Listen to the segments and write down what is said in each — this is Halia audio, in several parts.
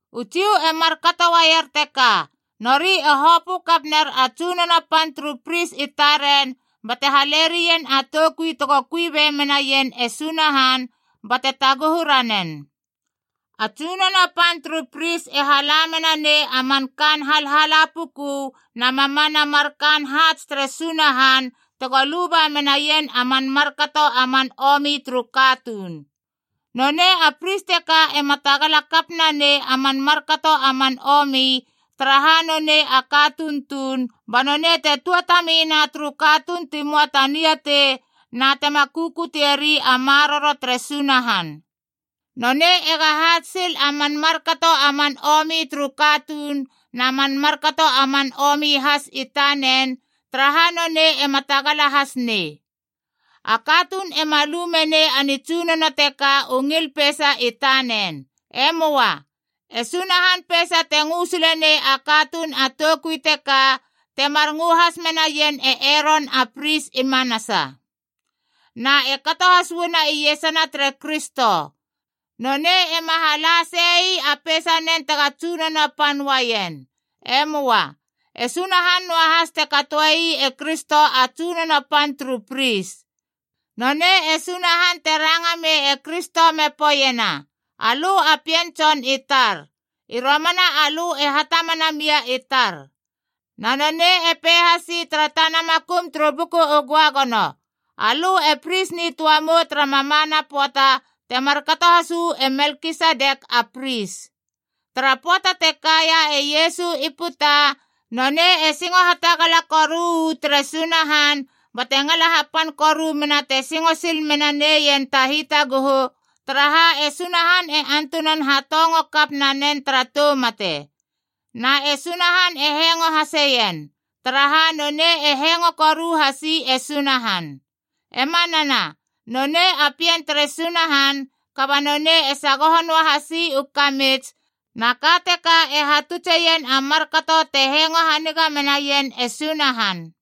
U Jiu e markato uaier teka: nori e hopö kap ner a tsunono pan turu pris i taren bate hale rien a toukui tego kui be menaien e Sunahan bate taguhu ranen. A tsunono pan turu pris e hala mena nei a man kaan halhala puku na mamana mar kaan haats tere Sunahan tego luba menaien a man markato a man omi turu katuun. Nonei a pris teka ema tagala kap nanei a man markato a man omi, taraha nonei a katuun tuun, ba nonei te tuatami na turu katuun ti moa ta niatei na tema kukutieri a maroro tere Sunahan. Nonei ega haats sil a man markato a man omi turu katuun na man markato a man omi has i tanen, taraha nonei ema tagala has nei. A katuun ema lu menei a nitsunono teka u ngil peisa i tanen. E möa. E Sunahan peisa te ngö sile nei a katuun a toukui teka, temar ngö has menaien e Eron a pris i manasa. Na e kato has uana iesana tere Kristo. Nonei ema hala sei ii a peisanen tega tsunono pan uaien. E möa. E Sunahan noahas te katoe ii e Kristo a tsunono pan turu pris. Nonei e Sunahan te ranga mei e Kristo me poeiena, “Alö a Pien Tson i tar. I romana alö e hatamana mia i tar.” Na nonei e pei hasi tara tana makum turu Buku u Göagono, “Alö e pris nitöa mou tara mamana pöata te markato has uu e Melkisedek a pris.” Tara pöata te kaia e Iesu i puta, nonei e singo hatagala koru u tere Sunahan bate ngala hapan koru mena te singo sil menaneien ta hitaguhu, taraha e Sunahan e antunan hatongo kap nanen tara tou mate. Na e Sunahan e hengo haseien, taraha nonei e hengo koru hasi e Sunahan. E manana, nonei a Pien tere Sunahan, kaba nonei e sagoho noahasi u kamits, na ka teka e hatutseien a markato te hengo haniga menaien e Sunahan.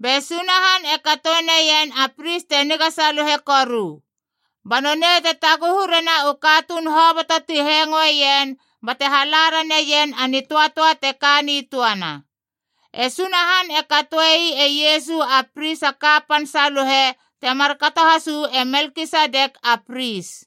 Be Sunahan e katoe neien a pris te niga saluhe koru. Ba nonei te taguhu rena u katuun hoboto ti hengoeien bate hala raneien a nitöatöa te ka nitöana. E Sunahan e katoe ii e Iesu a Pris a kapan saluhe te markato has uu e Melkisedek a pris.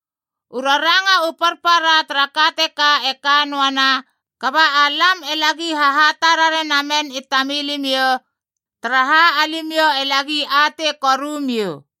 U raranga u parpara tara ka teka e kanoana, kaba alam e lagi hahatarare namen i tamilimiou, taraha alimiou e lagi atei koru miou.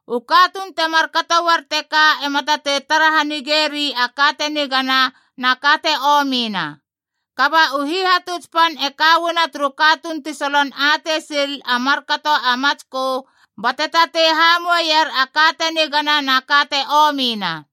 U katuun temar kato uar teka ema tatei tara hanigeri a ka te nigana na ka te omina. Kaba u hihatuts pan e ka uana turu katuun ti solon atei sil a markato a matskö, bate tatei hamoueier a ka te nigana na ka te omina.